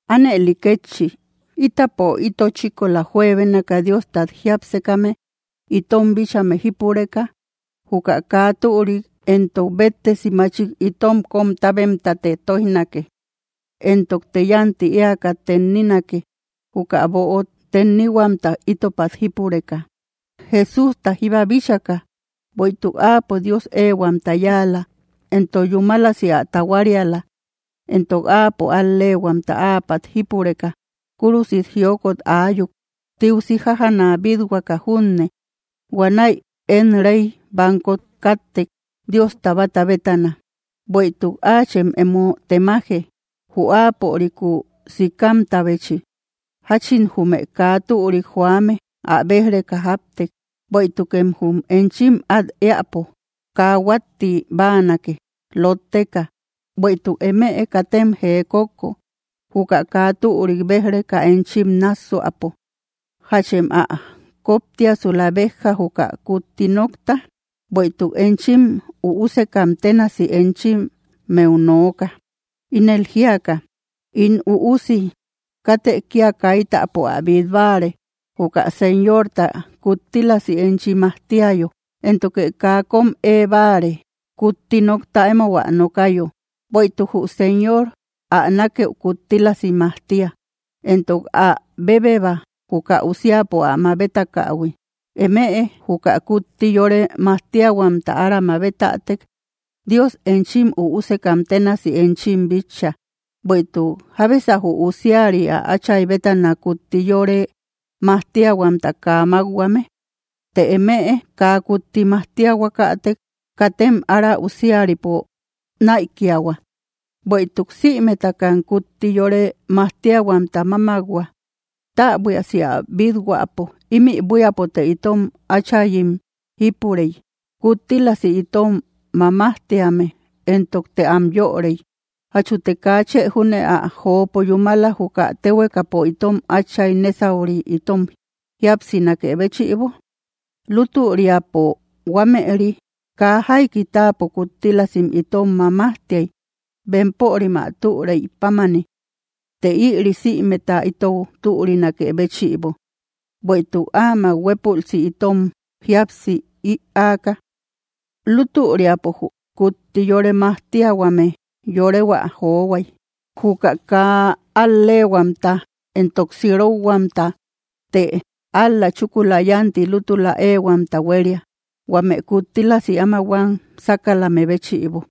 Ánëli kétchi, ítapo ito chíkola juebénaka Diostat jiápsekame itom bíchame jípureka, juka kaa türik entok béttesi machik itom kom tábemtate tóijnake; entokte yánti éaka tenninake, juka böot tennihuamta ítopat jípureka, Jesústa jíba bíchaka. Bueïtuk Áapo Dios éehuamta yáala, entok yúmalasi ä tahuariala. Entok Áapo al‑leehuamta áapat jípureka, kúrusit jiokot aayuk, tiusi jájana bít-huaka junne. Huanäi én rey bankot kattek Diosta báta bétana. Bueïtuk áachem emo temaje, jü Áaporikúu sikamtahui, jáchin jume kaa türik joame ä béj‑reka jáptek, bueïtukem jum enchim át éäpo kaa huátti báanake, lótteka. Bueïtuk emëe katem jee kókko, juka kaa türik béj‑reka enchim nássuäpo. ¿Jachem ä kóptiasula béjja, juka kutti nokta? Bueïtuk enchim üusekam ténasi enchimmeu nooka, ínel jíaka: In üusi, katë kia kaitäpo ä bít báare, juka Señorta kuttílasi enchi majtiayo, éntoke kaa kóm ée báare, kutti nokta emou ä nokayo. Bueïtuk jü Señor ä nákëu kuttílasi majtia, entok ä bébeba, juka usiapo ä mabetakähui. Emëe juka kutti yore majtiahuamta ára mabetätek, Dios enchim üusekam ténasi enchim bitcha. Bueïtuk, ¿jábesa jü usiari ä áchay bétana kutti yore majtiahuamta kaa mákhuame? Të emëe kaa kutti majtiahuakatek, katem ára usiaripo näikiahua, bueïtuk sïmetakam kutti yore majtiahuamta mámak-hua. Täbuiasi ä bít-huäpo, ímï buíapote itom áchayim jípurey, kuttílasi itom mamajtíame, entokte am yörey. ¿Jachute kaa chë júne ä jopo yúmala, juka téhuekapo itom áchay nésauri, itom jíapsinakë béchïbo? Lútüriapo huámëri kaa jaiki táapo kuttílasim itom mamajtiay, bempörim ä türeï pámani; të ïri sïmeta itou türinakë béchïbo, bueïtuk áamak huépülsi itom jíapsi ïaaka. Lútüriapo jü kutti yore majtiahuame yorehuä johuay, juka kaa al‑leehuamta entok sirokhuamta; të ál‑la chúkula yánti lútula éehuamta huéria, huame kuttílasi áma huam sákalame béchïbo.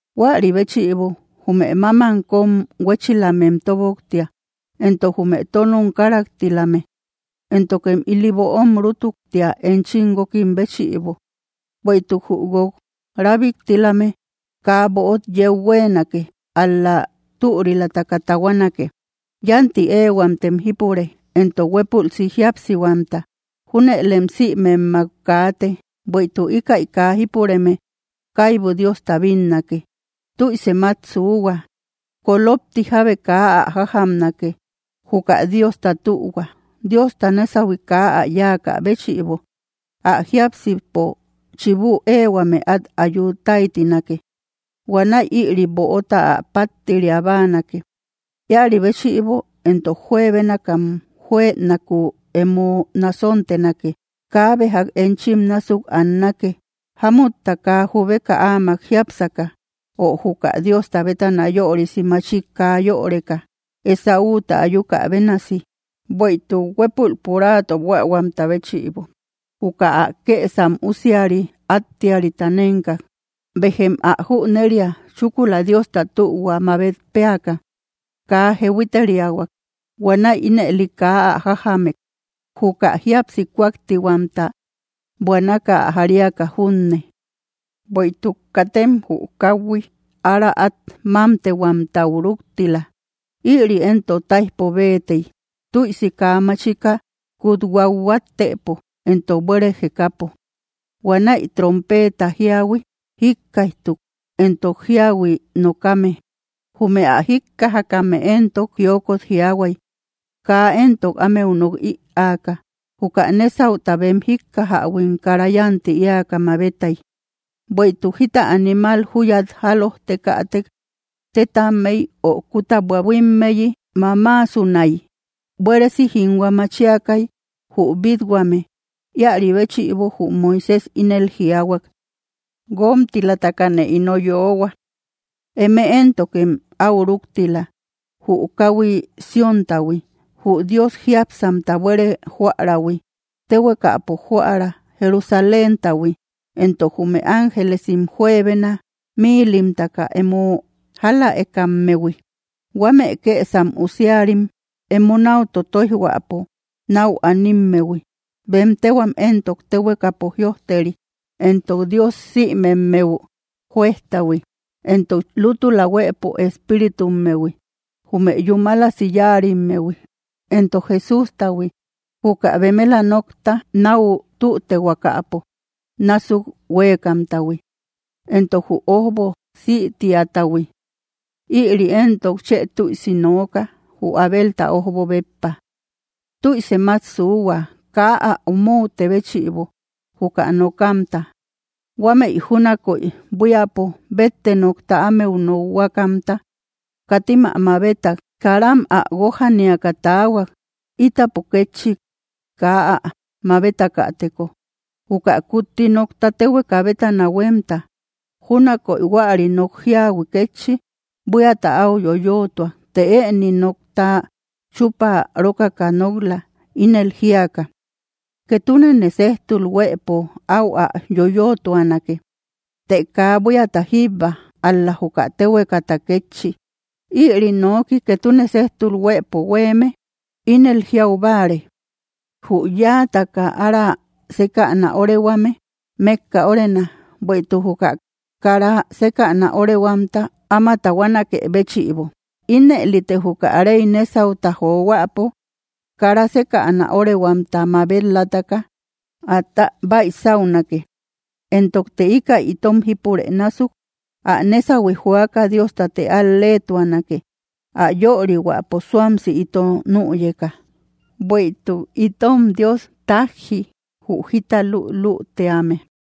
Huäri béchïbo, jume mámam kón huéchilamem tóboktia, entok jume tónom karaktilame. Éntokem ili böom rútuktia, enchim guókim béchïbo, bueïtuk jü guók rábiktilame kaa böot yeu huéenake, ál‑la türilataka tahuanake. Yánti éehuamtem jípure, entok huépülsi jíapsihuamta. Júnëlem sïmemmak kaate, bueïtuk íkäi kaa jípureme kaibu Diosta bínnake. Tüisem át suuhua, kolopti jábe kaa ä jájamnake, juka Diosta tühua. Diosta nésahui kaa ä yáakä béchïbo, ä jiápsipo chibu éehuame át ayu táytinake. Huanäi ïri böota ä páttiria báanake. Íäri béchïbo éntok, juebénakam juënakuu emo nasontenake. Kaabe jak enchim násuk annake, jámutta kaa jubeka áamak jiápsaka, ö juka Diosta bétana yörisi machik kaa yöreka, Esáuta ayuka bénasi. Bueïtuk huépul puraato buähuamta béchïbo, juka ä kësam usiari áttiarita nénkak. Béjem ä jüneria, chúkula Diosta tühua mabet péaka, kaa jehuiteriahuak. Huanäi ínëli kaa ä jájamek, juka jíapsi kuaktihuamta, buanaka ä jariaka junne. Bueïtuk katem jü káhui ára át mámtehuamtau rúktila. Ïri éntok táijpo béetey, tüisi kaa machika kut huathuattëpo entok buére jekäpo. Huanäi trompeeta jíahui jíkkaijtuk, entok jíahui nokame. Jume ä jíkkajakame éntok jiokot jiaahuay, kaa éntok ámeu nok ïaaka. Juka nésauta bem jíkkajähuim kara yánti éaka mabetay: “Bueïtuk jita animal júyat jálojtekätek tétammey ö kúta buahuimmeyi mamaasunay.” Buéresi jínhua machiakay jü bít-huame; íäri béchïbo jü Moisés ínel jiaahuak: “Guómtilatakane ino yoohua.” Eme éntokem áu rúktila, jü káhui Sióntahui, jü Dios jiápsamta buére jóarähui, téhuekapo jóära Jerusaléntahui, entok jume ángelesim juebena míilimtaka emo jáläekammehui, huame kësam usiarim emo náu totoijhuäpo náu animmehui, bem téhuam éntok téhuekapo jïojteri, entok Dios sïmemmeu Jueztahui, entok lútula huëpo espíritummehui, jume yúmalasi yáarimmehui, entok Jesústahui, juka bemela nokta náu tütehuakapo násuk huéekamtahui, entok jü ójbo sïtiatahui; ïri éntok chë tüisi nooka, jü Abelta ójbo béppa. Tüisem át suuhua, kaa ä omoute béchïbo, juka nokamta. Huámëi júnakoy buíapo bétte nokta ámeu nokhuakamta, katim ä mabetak; karam ä guójaniaka taahuak. Ítapo kétchi, kaa ä mabetakäteko, juka kutti nokta téhueka bétana huémta. Júnakoy huäri nok jíahui kétchi buíata áu yoyootuak, të ëni nokta chúpa rókaka nok‑la, ínel jíaka: “Ketunene séjtul huëpo, áu ä yoyootuanake, të kaa buíata jíbba, ál‑la juka téhuekata kétchi.” Ïri nooki, “ketune séjtul huëpo huéeme”, ínel jiau báare: jü yáataka ára sékäna órehuame mékka órena, bueïtuk juka kara sékäna órehuamta áma tahuanaké béchïbo. Inëlite juka rey nésauta johuäpo kara sékäna órehuamta mabet‑lataka, atä baysaunake, entokte íkäi itom jípurë násuk, ä nésahui joaka Diostate al-leetuanake, ä yörihuäpo suamsi ito nüyeka. Bueïtuk itom Dios tájji jü jita lülütíame.